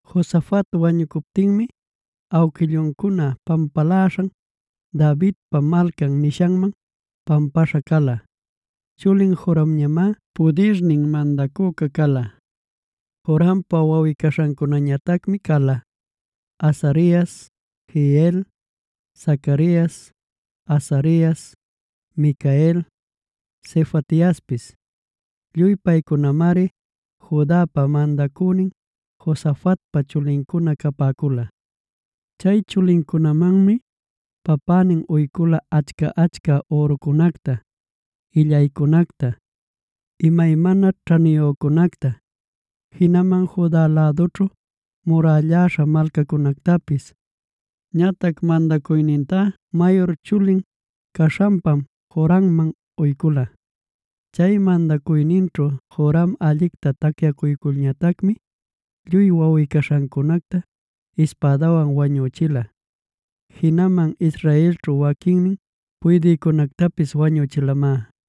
Josafat wañucuptinmi awquilluncuna pampaläśhan Davidpa Malcan nishanman pampaśha cala. Chulin Joramñamá pudirnin mandacüca cala. Jorampa wawꞌi-caśhancunañatacmi cala: Azarias, Jehiel, Zacarias, Azarias, Micael, Sefatiaspis. Lluy paycunamari Judapa mandacünin Josafatpa chulincuna capäcula. Chay chulincunamanmi papänin uycula achca-achca ürucunacta, illaycunacta, imaymana ćhaniyücunacta, jinaman Juda lädućhu murälläśha malcacunactapis. Ñatac mandacuynintá mayur chuli caśhanpam Joramman uycula. Chay mandacuyninćhu Joram allicta tacyacuyculñatacmi, lluy wawꞌi-caśhancunacta ispädawan wañüchila; jinaman Israelćhu waquinnin puydïcunactapis wañüchilamá.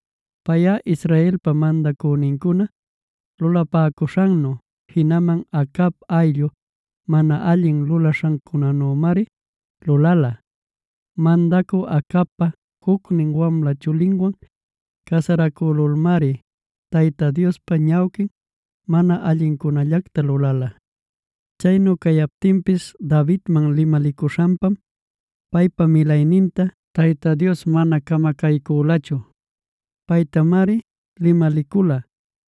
Payꞌa, Israelpa mandacünincuna lulapäcuśhannu, jinaman Acab ayllu mana allin lulapäcuśhannümari lulala. Mandacü Acabpa jucnin wamla chulinwan casaracülulmari Tayta Diospa ñawquin mana allincunallacta lulala. Chaynu cayaptinpis Davidman limalicuśhanpam paypa milayninta Tayta Dios mana camacaycülachu. Paytamari limalicula: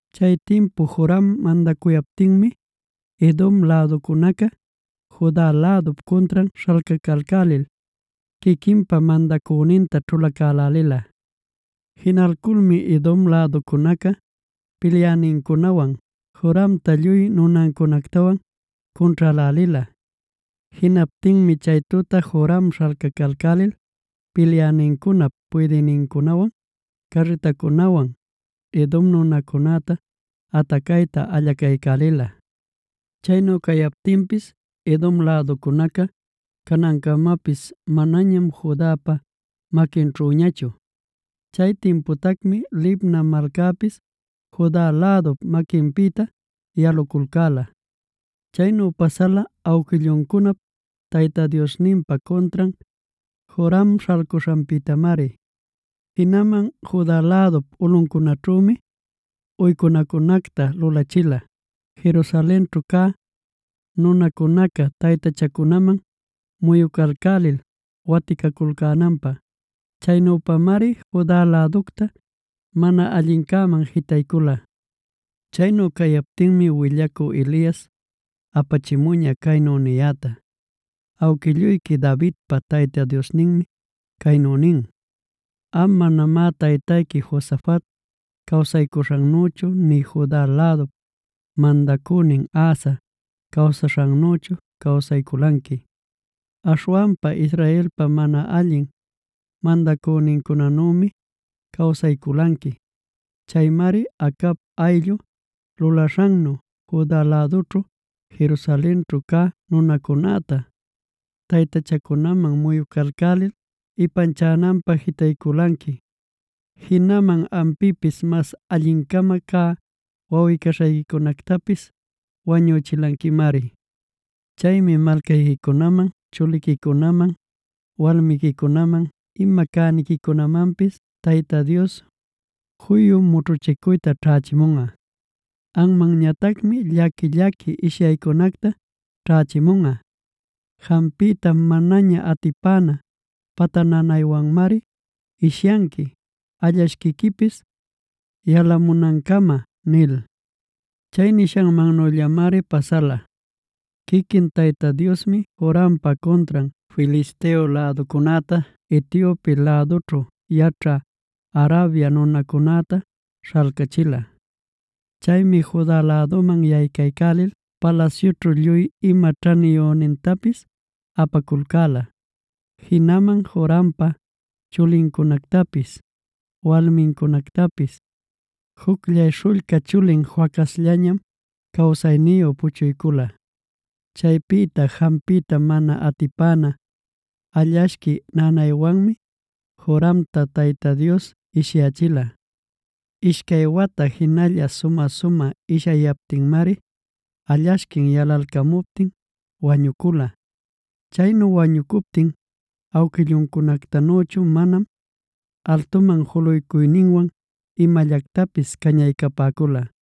Chay timpu Joram mandacuyaptinmi Edom läducunaca Juda lädup cuntran śhalcacalcälilc quiquinpa mandacüninta ćhulacälälila. Jinalculmi Edom läducunaca pilyänincunawan Joramta lluy nunancunactawan cunćhälälila. Jinaptinmi chay tuta Joram śhalcacalcälil pilyänincunap puydïnincunawan, carritancunawan Edom nunacunäta atacayta allacaycälila. Chaynu captinpis Edom läducunaca canancamapis manañam Judapa maquinćhüñachu. Chay timputacmi Libna malcapis Juda lädup maquinpïta yaluculcäla. Chaynu pasala awquilluncunap Tayta Diosninpa cuntran Joram śhalcuśhanpïtamari. Jinaman Juda lädup ulꞌuncunaćhümi uycunacunacta lulachila, Jerusalenćhu cä nunacunaca taytachacunaman muyucalcälil waticaculcänanpä. Chaynüpamari Juda läducta mana allincäman jitaycula. Chaynu cayaptinmi willacü Elias apachimuña caynu niyäta: “Awquilluyqui Davidpa Tayta Diosninmi caynu nin: ‘Am manamá taytayqui Josafat cawsaycuśhannüchu nï Juda lädup mandacünin Asa cawsaśhannüchu cawsayculanqui. Aśhwanpa Israelpa mana allin mandacünincunanümi cawsayculanqui. Chaymari Acab ayllu lulaśhannu Juda lädućhu, Jerusalenćhu cä nunacunäta, taytachacunaman muyucalcälil ipanchananpä jitayculanqui. Jinaman ampïpis mas allin-cama cä, wawꞌi-caśhayquicunactapis wañüchilanquimari. Chaymi malcayquiman, chuliquicunaman, walmiquicunaman, ima cäniquicunamanpis Tayta Dios, juyu mućhuchicuyta ćhächimunꞌa. Anmanñatacmi llaqui-llaqui ishyaycunacta ćhächimunꞌa. Jampiyta manaña atipana pata nanaywanmari ishyanqui allashquiquipis yalamunancama’” nil. Chay nishannüllamari pasala. Quiquin Tayta Diosmi Jorampa cuntran Filisteo läducunäta Etiope lädućhu yaćhä Arabia nunacunäta śhalcachila. Chaymi Juda läduman yaycaycälil palasyućhu lluy ima ćhaniyünintapis apaculcäla, jinaman Jorampa chulincunactapis walmincunactapis. Jucllay śhullca chulin Joacazllañam cawsayniyu puchuycula. Chaypïta jampiyta mana atipana allashqui nanaywanmi Joramta Tayta Dios ishyächila. Ishcay wata jinalla sumä-sumä ishyayaptinmari allashquin yalalcamuptin wañucula. Chaynu wañucuptin awquilluncunactanüchu manam altuman juluycuyninwan imallactapis cañaycapäcula.